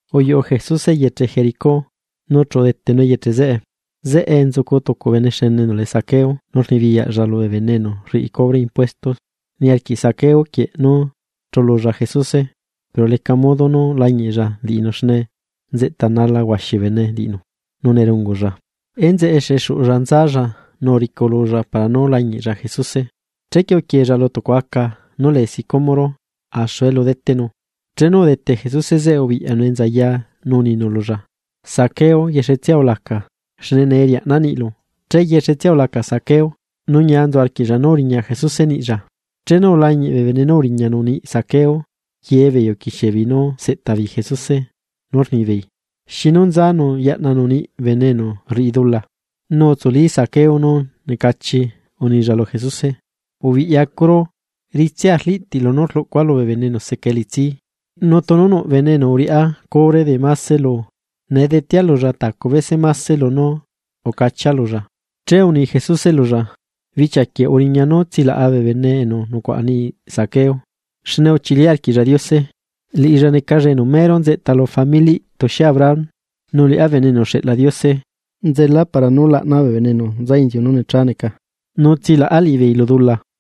Uyuꞌu Jesuse eyeche Jericó, nu chu udetenu eyeche zeꞌe. Zeꞌe nzucu tucu bene xene enu lee Zaqueo nu rnibiyaꞌlla lubee bene enu rriꞌi cubre impuesto. Niarquiꞌ Zaqueo quieꞌ nú chululla Jesuse, pero leca modo nú lañiꞌlla liꞌinu xne nzeꞌtanala huaxi bee bene liꞌinu, nu nerungulla. Enzeꞌe uyecaxuꞌulla nu uricululla, para nú lañiꞌlla Jesuse, chequie uquiella lu tucu aca nú lee sicómoro axu elu detenu. Chenu udete Jesuse zeꞌe, ubiꞌyanu enzeya nu uninu lulla: ―Zaqueo yexetsia ulaca, xne nee riaꞌna niꞌlu. Che yexetsia ulaca Zaqueo, nu ñia nzu arquiꞌlla nú uriña Jesuse niꞌlla. Chenu ulañiꞌ bee bene nú uriñanu niꞌi Zaqueo, ye beei uquixie beei nú seꞌta beei Jesuse nu rnibeei xinú nzanu yaꞌnanu niꞌ bene enu rluꞌcu dula. Nu utsuli Zaqueo nu necachi unilla lu Jesuse: ―Ubiꞌyacuru, ritsia arliꞌtiꞌ lunú rlucua lubee bene enu seca elitsi. Nu tunu nuꞌ bene enu uriꞌá cubre de mase lu, nee detea lulla tacu bese mase lunú ucachia lulla. Che uni Jesuse lulla: ―Bichia quieꞌ uriña nú tsilaꞌa bee bene enu nucuaꞌa niꞌ Zaqueo, xne uchili arquiꞌlla Diose, liꞌilla necalla enu mero nzeꞌta lu familiꞌ tuxie Abraham. Nu liꞌá Bene enu uxeꞌla Diose, nzela para nú laꞌna bee bene enu nza inziu nú necha neca, nu tsilaꞌa liꞌibeei lu dula.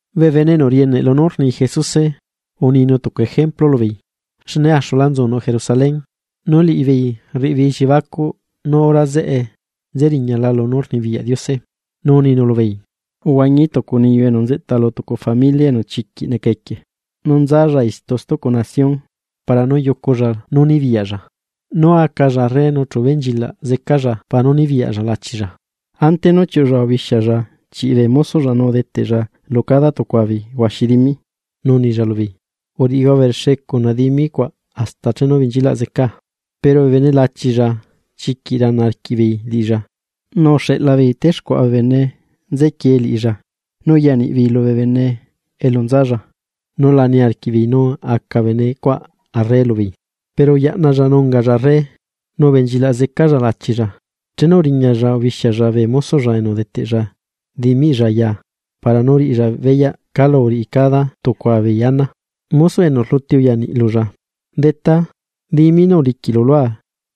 Bee bene enu rieneꞌ lunú rni Jesuse, uninu tucu ejemplu lubeei, xne axula nzunu Jerusalén, nu liꞌibeei rriꞌi beei elliebacuꞌ nu hora zeꞌe nze riñala lunú rnibiyaꞌ Diose. Nu uninu lubeei: ―Uhuañi tucu niyu enu nzeꞌta lu tucu famili enu chiquiꞌ neca equie, nu nzalla istu stucu nación para nú yuculla nú nibiyaꞌlla, nú acalla arre nu chu benchilaꞌ zecalla para nú nibiyaꞌlla lachilla. Ante nú chiuꞌulla, ubixialla chiꞌi bee mosoꞌlla nu udeteꞌlla lu cada tucua beei tucu dimi nú huaxi seca, nu unilla lubeei: “Uriꞌihua berexe cuna dimi cuaꞌ hasta chenu benchilaꞌ zecaa.” Pero bee bene lachilla, chiquiꞌ rana arquiꞌbeei liꞌilla, nu uxeꞌla beei texcuaꞌa bee bene nzequie liꞌilla nu uya niꞌ beei lubee bene elu nzalla nú la niarquiꞌbeei nú aca bene cuaꞌ arre lubeei. Pero uyaꞌnalla nú ungalla arre, nu ubenchilaꞌ zecalla lachilla. Chenu uriñalla ubixialla bee mosoꞌlla enu udeteꞌlla dimiꞌlla ya para nú riꞌilla beyaꞌ calu uriꞌi cada tucua beei ana. Mosoꞌ enu rluti uya uni lulla: “Detá, dimi nú uliquiꞌlu lua,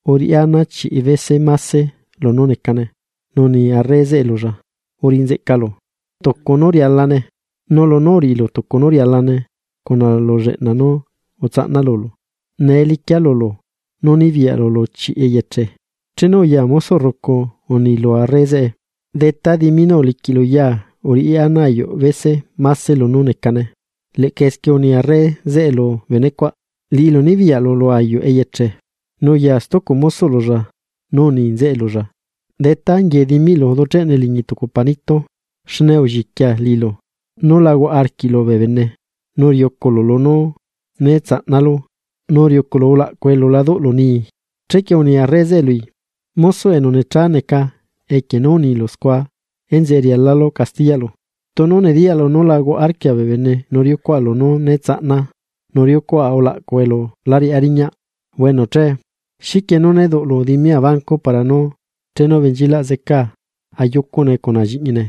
uriꞌi ana chiꞌi bese mase lunú necane.” Nu uni arre zeꞌe lulla: “Uriꞌi nzeꞌcalu, tucu nú rialane. Nu lunú uriꞌilu tucu nú rialane cuna lu lleꞌna nú utsaꞌna lulu, nee liquia lulu nú nibiyaꞌlu lu chiꞌi eyeche.” Chenu uya mosoꞌ rrucu unilla lu arre zeꞌe: “Detá, dimi nú uliquiꞌlu ya uriꞌi ana ayuꞌ bese mase lunú necane.” Leꞌca esquie uni arre zeꞌe lu benecuaꞌ: “Liꞌilu nibiyaꞌlu lu ayuꞌ eyeche.” Nu uya stucu mosoꞌ lulla nu uni nzeꞌe lulla: “Detá, nguie dimiꞌlu. Uducheꞌne liñi tucu panitu, xne ulliquia liꞌilu nú la huaꞌa arquiꞌlu bee bene, nu riuculu lunú né tsaꞌnalu, nu riuculu ulaꞌcu elu la duꞌlu nii.” Chequie uni arre zeꞌe lui: “Mosoꞌ enu necha neca, equie nú unilu scua enzeꞌe rialálu castiyaꞌlu. Tunu nediyaꞌlu nú la huaꞌa arquia bee bene nu riucuꞌa lunú né tsaꞌna nu riucuꞌa ulaꞌcu elu la riꞌá riñaꞌ, bueno che, ¿xiquie nú né duꞌlu dimia banco para nú chenu ubenchilaꞌ zecaa ayucuꞌne cuna lliꞌñine?”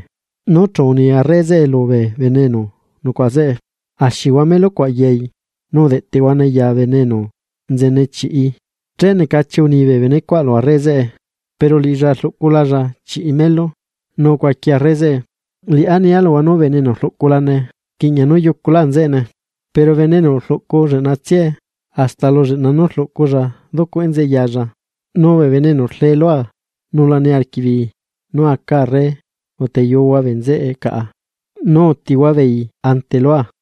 Nu chu uni arre zeꞌe lubee bene enu nucuaꞌa zeꞌe: “Axihua melu cuaꞌ yai, nu udeteꞌhuane ya bene enu nzene chiꞌi.” Che necachi uni bee benecuaꞌ lu arre zeꞌe: “Pero liꞌilla rluꞌculalla chiꞌi melu.” Nu ucuaqui arre zeꞌe: “Liꞌá nia luhua nu bene enu rluꞌculane, rquiꞌña nú yuculá nzeꞌene; pero bene enu rluꞌcu lleꞌnatsiae, hasta lu lleꞌna nú rluꞌculla ducuꞌ enzeꞌe yalla. Nu bee bene enu rlee lua nu la niarquiꞌ beei nu aca arre, uteyuhua bee nzeꞌe caꞌa, nu útihua beei lua.”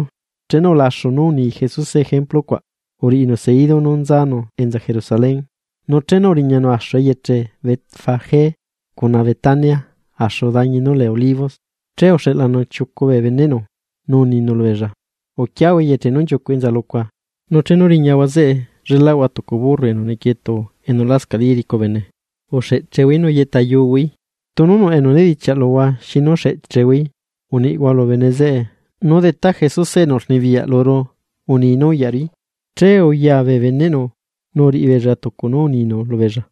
Chenu ulaxu nú uni Jesuse ejemplu cuaꞌ, uriꞌinu seidu nú nzanu enza Jerusalén. Nu chenu uriñanu axu eyeche Betfagé cuna Betania axu dañi nú lee Olivos, che uxeꞌlanu chiucu bee beneꞌnu, nu uninu lubeella: ―Uquiahua eyeche nú nchiucuꞌ enza lucuaꞌ. Nu chenu riñahua zeꞌe llelaꞌhua tucu burro enu niquietu enu lascaꞌlí ricu bene. Uxeꞌchehuaií nu yeꞌtayuhuaií. Tunu nuꞌ enu nedichiaꞌ luhua xinu xeꞌchehuaií, uniꞌhua lu bene zeꞌe nú Detá, Jesuse enu rnibiyaꞌ luru uni nú uyaꞌruií. Che uyaa bee beneꞌnu nu uriꞌi beella tucu nú uninu lubeella.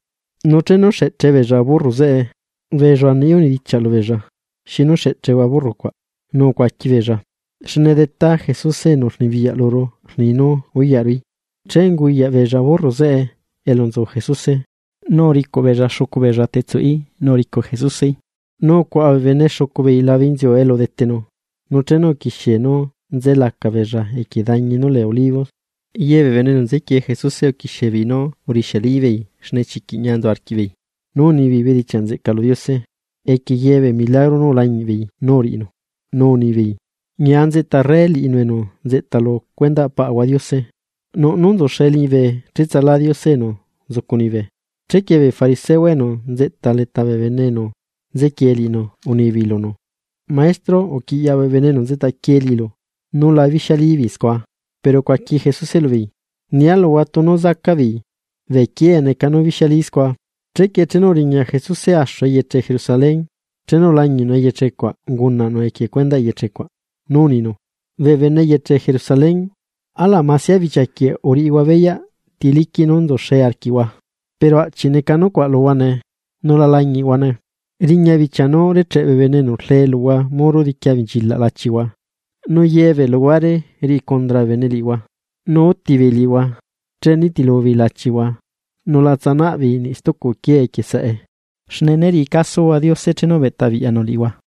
Nu chenu xeꞌche beella burro zeꞌe, bee lluaanaꞌí unidichiaꞌ lubeella: ―¿Xinu xeꞌchehua burro cuaꞌ? Nu ucuaqui beella: ―Xne Detá, Jesuse rni nú uyaꞌruií. Che unguyaꞌ beella burro zeꞌe elu nzu Jesuse, nu uricuꞌ beella xucu beella equieií nu uricu Jesuse equieií. Nu ucuaꞌa bee bene xucu beei labe inziu elu udetenu. Nu chenu uquixie nú nze laca beella equie dañi nú lee Olivos, ye bee bene enu nzequie Jesuse uquixie beei nú urixialibeei xne chiquiꞌ ñia nzu arquiꞌbeei, nu unibeei bedichiaꞌ nzeꞌca lu Diose, equie ye bee milagro nú ulañiꞌ beei nú uriꞌinu. Nu unibeei: ―¡Ñia nzeꞌta arre, liꞌinu enu nzeꞌta lu cuendaꞌ Paꞌahua Diose! ¡Nuꞌ nú nzuxe liñibe cheꞌtsa Diose enu nzucu liñibe! Chequie bee fariseo enu nzeꞌta leta bee bene enu nzequie liꞌinu unibeei lunu: ―Maestro, uquiꞌyaꞌ bee bene enu nzeꞌtaquie liꞌilu nú la bixialí beei scua. Pero ucuaqui Jesuse lubeei: ―Nia luhua tunu zaca beei, bee quie neca nú bixialí scua. Chequie chenu uriña Jesuse axu eyeche Jerusalén, chenu ulañiꞌnu eyeche cuaꞌ ungunaꞌnu equie cuendaꞌ eyeche cuaꞌ, nu uninu: ―¡Bee bene eyeche Jerusalén, alaꞌ masia bichiaquieꞌ uriꞌihua beyaꞌ ti liquiꞌ nú nzuxe arquiꞌhua! Pero aꞌchi neca nucuaꞌ luhua nee, nu la lañiꞌhuane. Riña bichia nú recheꞌe bee bene enu rlee luhua muro diqui abenchilaꞌ lachihua, nu diqui bee luhuare riꞌi condra bee bene liꞌihua, nu úti beei liꞌihua. Che nitilu beei lachihua, nu la tsaꞌna beei niꞌ stucu quiee equie saꞌe, xne né riꞌihua caso Diose chenu ubeꞌta biꞌyanu liꞌihua.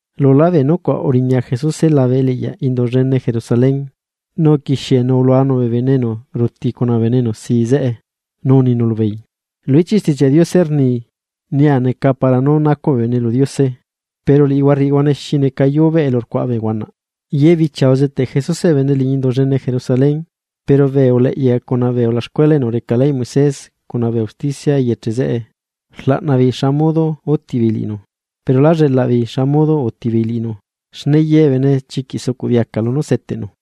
Lulá bee nucuaꞌ, uriña Jesuse labe eliꞌyaꞌ Indu llene Jerusalén, nu uquixienu uluanu bee bene enu ruti cuna bee bene enu sii zeꞌe, nu uninu lubeei: ―Lu ichiꞌ Stichiaꞌ Diose rni: “Nia neca para nú nacuꞌ bee bene lu Diose”, pero liꞌihua rriꞌihuane xi neca yubeꞌ elu rcuaꞌa bee huanaꞌ. Ye bichia uzeteꞌ Jesuse bee bene liñi indu llene Jerusalén, pero bee uleꞌya cuna bee ulaxcuela enu reca leyꞌ Moisés cuna bee usticia eyeche zeꞌe, rlaꞌna beei xa modo úti beei liꞌinu. Pero la llelaꞌ beei xa modo úti beei liꞌinu, xne ye bee bene chiquiꞌ sucuꞌ diaca lunú seteꞌnu.